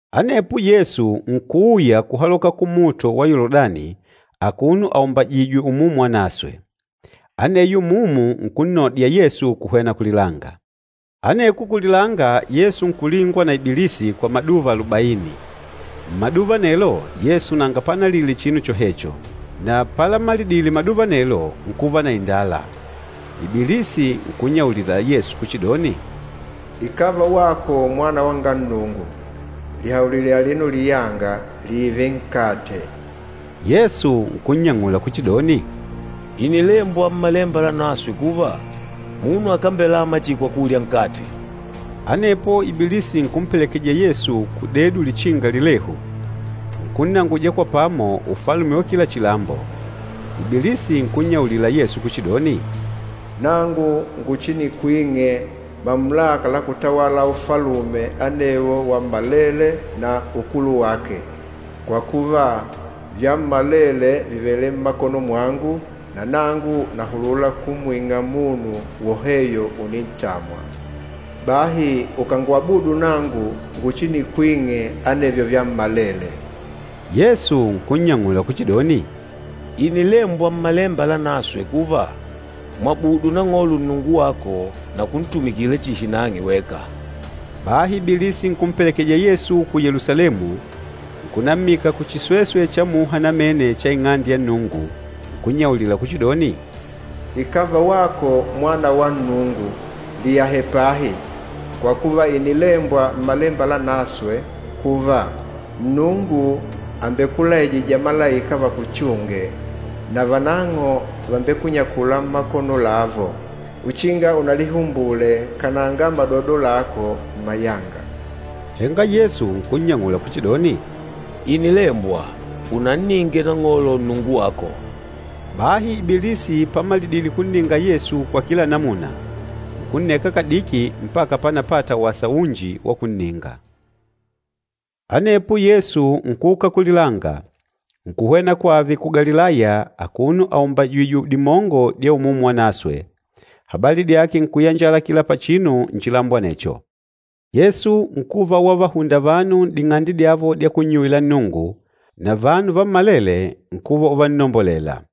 Anepo Yesu nkuuya kuhaloka kuluhunde lwa Yoludani akuno aumbajìjwè Umumu Wanaswe. Aneyo Umumu nkunnodya Yesu kuhwena kulilanga. Aneko kulilanga Yesu nkulingwa na Ibilisi kwa maduva alubaini. Mmaduva anelo, Yesu nanga panalile chinu chohecho, na palamalidile maduva anelo, nkuva na indala. Ibilisi nkunnyaulila Yesu kuchidoni, “Ikàva wako Mwana wanga Nnungu, lihaulile alino liyanga lììve nkate.” Yesu nkunnyang'ula kuchidoni, “Ìnilembwa Mmalemba Lanaswe kuva, ‘Munu akambelama chihi kwa kulya nkate.’” Anepo Ibilisi nkumpelekeja Yesu kudedu lichinga lilehu, nkunnanguja kwa pamo ufalume wa kila chilambo. Ibilisi nkunnyaulila Yesu kuchidoni, “Nangu nguchinikwing'e mamulaka la kutawala ufalume anewo wammalele na ukulu wake, kwa kuva, vyammalele vìvele mmakono mwangu, na nangu nahulula kumwing'a munu woheyo unintamwa. Bahi ukàngwabudu nangu nguchinikwing'e anevyo vyammalele.” Yesu nkunnyang'ula kuchidoni, “Ìnilembwa Mmalemba Lanaswe kuva, ‘Mwabudu Nang'olo Nnungu wako, na kuntumikila chihi nang'e weka.’” Bahi Ibilisi nkumpelekeja Yesu ku Yelusalemu, nkunammika kuchisweswe cha muha namene cha Ing'ande ya Nnungu, nkunyaulila kuchidoni, “Ikàva wako Mwana wa Nnungu, liyahe pahi, kwa kuva, ìnilembwa Mmalemba Lanaswe kuva, ‘Nnungu àmbekulaijija malaika vakuchunge, na vanang'o vàmbekunyakula mmakono lavo, uchinga unalihumbule kananga madodo lako mmayanga.’” Henga Yesu nkunnyang'ula kuchidoni, “Ìnilembwa, ‘Unanninge Nang'olo, Nnungu wako.’” Bahi Ibilisi pamalidile kunninga Yesu kwa kila namuna, nkunneka kadiki mpaka pánapàtà wasa unji wa kunninga. Anepo Yesu nkuuka kulilanga, nkuhwena kwave ku Galilaya akuno aumbajìjwè dimongo dya Umumu Wanaswe, habali dyake nkuyanjala kila pachinu nchilambo anecho. Yesu nkuva wavahunda vanu n'ding'ande dyavo dya kunnyuwila Nnungu, na vanu vammalele nkuva uvannombolela.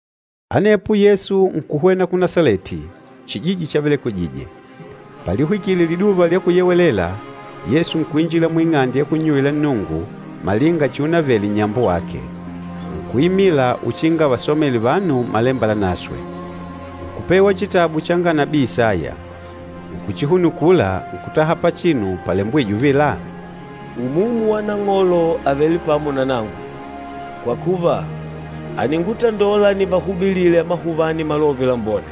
Anepo Yesu nkuhwena ku Nasaleti, chijiji chavelekwejije. Palihwikile Liduva lya Kuyewelela, Yesu nkuinjila muing'ande ya kunnyuwila Nnungu, malinga chiunavele nnyambo wake. Nkuimila uchinga avasomele vanu Malemba Lanaswe. Nkupewa chitabu changa nabii Isaya. Nkuchihunukula, nkutaha pachinu palembwîje uvila, “Umumu wa Nang'olo àvele pamo na nangu. Kwa kuva, àningutandola nivahubilile amahuvani Malove Lambone.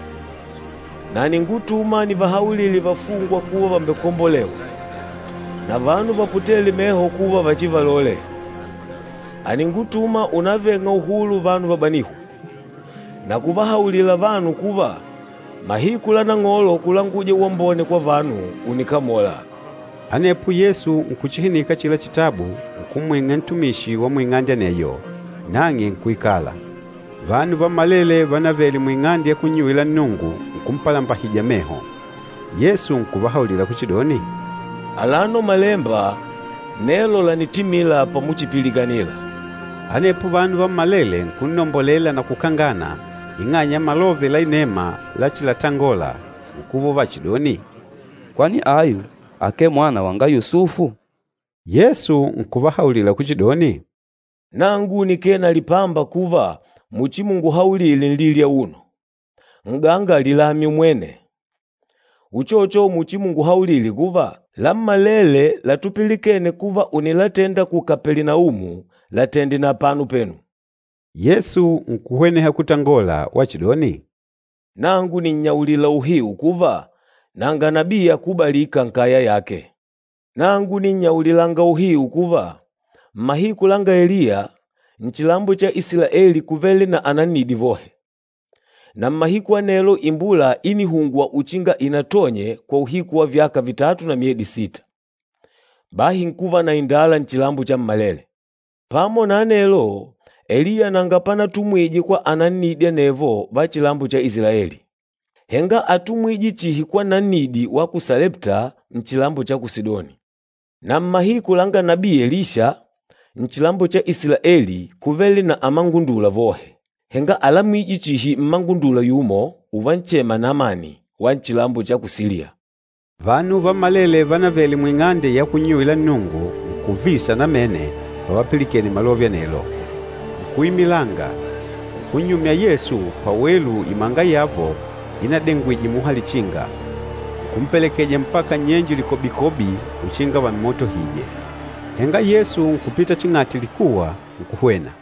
Na àningutuma nivahaulile vafungwa kuva vàmbekombolewa, na vanu vaputêle meho kuva vachivalole. Àningutuma unaveng'a uhulu vanu vabanîhwa, na kuvahaulila vanu kuva mahiku la Nang'olo kulanguja uwambone kwa vanu ùnikamola.” Anepo Yesu nkuchihinika achila chitabu, nkumwing'a ntumishi wa muing'ande aneyo, nang'e nkuikala. Vanu vammalele vanavele muing'ande ya kunnyuwila Nnungu nkumpalambahija meho. Yesu nkuvahaulila kuchidoni, “Alano Malemba, nelo lànitimila pamuchipilikanila.” Anepo vanu vammalele nkunnombolela na kukangana ing'anya ya malove la inema lachilatangola, nkuva uvachidoni, “Kwani ayu akee mwana wanga Yusufu?” Yesu nkuvahaulila kuchidoni, “Nangu nikee na lipamba kuva muchimunguhaulile nlili auno, ‘N'ganga lilamye umwene!’ Na muchimunguhaulile kuva, ‘Lammalele latupilikene kuva ùnilatenda ku Kapelinaumu, latende na apano penu.’” Yesu nkuhweneha kutangola wachidoni, “Nangu nìnnyaulila uhiu kuva, nanga nabii akubalîka nkaya yake. Nangu nìnnyaulilanga uhiu kuva, mmahiku langa Eliya, nchilambo cha Isilaeli kúvele na anannidi vohe. Na mmahiku anelo imbula ínihungwa uchinga inatonye kwa uhiku wa vyaka vitatu na myedi sita, bahi nkuva na indala nchilambo chammalele. Pamo na anelo, Eliya nanga panatumwije kwa anannidi anevo va nchilambo cha Isilaeli. Henga átumwije chihi kwa nannidi wa ku Salepta, nchilambo cha ku Sidoni. Na mmahiku langa nabii Elisha, nchilambo cha Isilaeli kúvele na amangundula vohe. Henga álamijwe chihi mmangundula yumo uvanchema Namani wa nchilambo cha ku Siliya.” Vanu vammalele vanavele muing'ande ya kunnyuwila Nnungu, nkuvisa namene pavapilikene malove anelo. Nkuimilanga, nkunnyumya Yesu pawelu imanga yavo inadengwije muha lichinga. Nkumpelekeja Yesu mpaka nnyenje likobikobi uchinga vammotohije. Henga Yesu nkupita ching'ati likuwa, nkuhwena.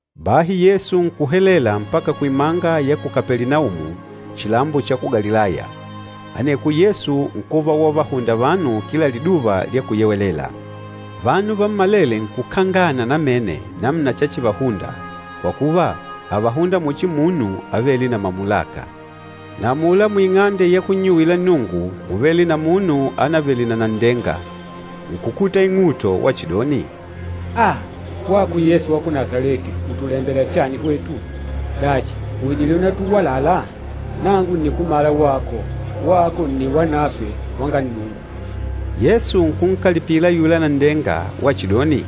Bahi Yesu nkuhelela mpaka kuimanga ya ku Kapelinaumu, chilambo cha ku Galilaya. Aneko Yesu nkuva wavahunda vanu kila Liduva lya Kuyewelela. Vanu vammalele nkukangana namene namuna chachivahunda, kwa kuva, ávahunda muchi munu avêle na mamulaka. Na amula muing'ande ya kunnyuwila Nnungu múvele na munu anavele na nanndenga, nkukuta ing'uto wachidoni, “Aaa! Wako Yesu wa ku Nasaleti ùtulembela chani hwetu? Dachi, ùidile unatuwalala? Nangu ǹnikumala wako. Wako nni Wanaswe wanga Nnungu!” Yesu nkunkalipila ayula nanndenga wachidoni,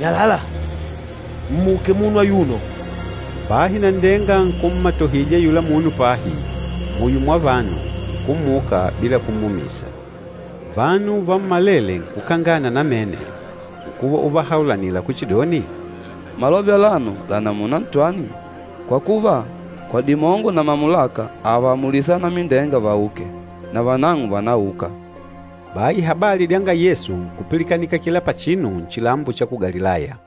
“Nyalala! Mmuke munu ayuno!” Bahi nanndenga nkummatohija ayula munu pahi, muyo mwa vanu, nkummuka bila kummumisa. Vanu vammalele nkukangana namene, nkuva uvahaulanila kuchidoni, “Malove alano la namuna ntwani? Kwa kuva, kwa dimongo na mamulaka àvaamulisa anamindenga vauke, na vanang'o vànauka!” Bahi habali dyanga Yesu nkupilikanika kila pachinu nchilambo cha ku Galilaya.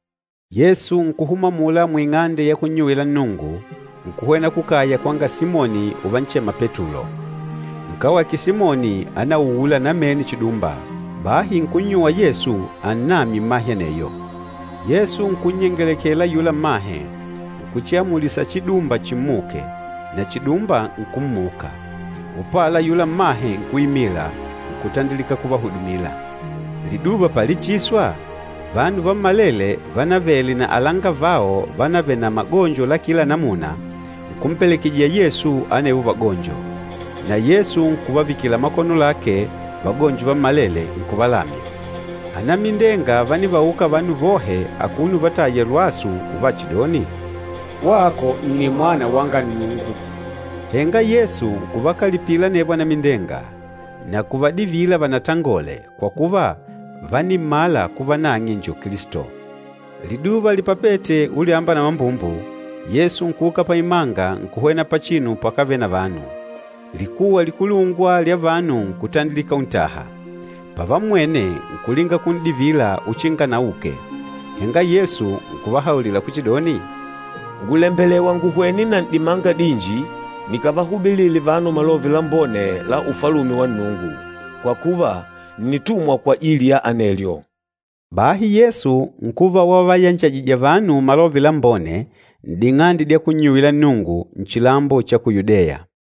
Yesu nkuhuma amula muing'ande ya kunnyuwila Nnungu, nkuhwena kukaya kwanga Simoni uvanchema Petulo. Nkawake Simoni ánauula namene chidumba, bahi nkunnyuwa Yesu annamye mmahe aneyo. Yesu nkunnyengelekela ayula mmahe, nkuchiamulisa chidumba chimmuke, na chidumba nkummuka. Upala ayula mmahe nkuimila, nkutandilika kuvahudumila. Liduva palichiswa, vanu vammalele vánavele na alangavao vánavele na magonjo la kila namuna, nkumpelekejija Yesu anevo vagonjo. Na Yesu nkuvavikila makono lake vagonjo vammalele, nkuvalamya. Anamindenga vánivauka vanu vohe akuno uvataya lwasu uvachidoni, “Wako nni Mwana wanga Nnungu!” Henga Yesu nkuvakalipila anevo anamindenga, na kuvadivila vanatangole kwa kuva, vánimmala kuva nang'e njo Kilisto. Liduva lipapete ulyamba na mambumbu, Yesu nkuuka paimanga nkuhwena pachinu pakávele na vanu. Likuwa likulungwa lya vanu nkutandilika untaha. Pavammwene nkulinga kun'divila uchinga anauke. Henga Yesu nkuvahaulila kuchidoni, “Ngùlembelewa nguhwene na n'dimanga dinji nikavahubilile vanu Malove Lambone la Ufalume wa Nnungu, kwa kuva, ǹnitumwa kwajili ya anelyo.” Bahi Yesu nkuva wavayanjajija vanu Malove Lambone n'ding'ande dya kunnyuwila Nnungu, nchilambo cha ku Yudeya.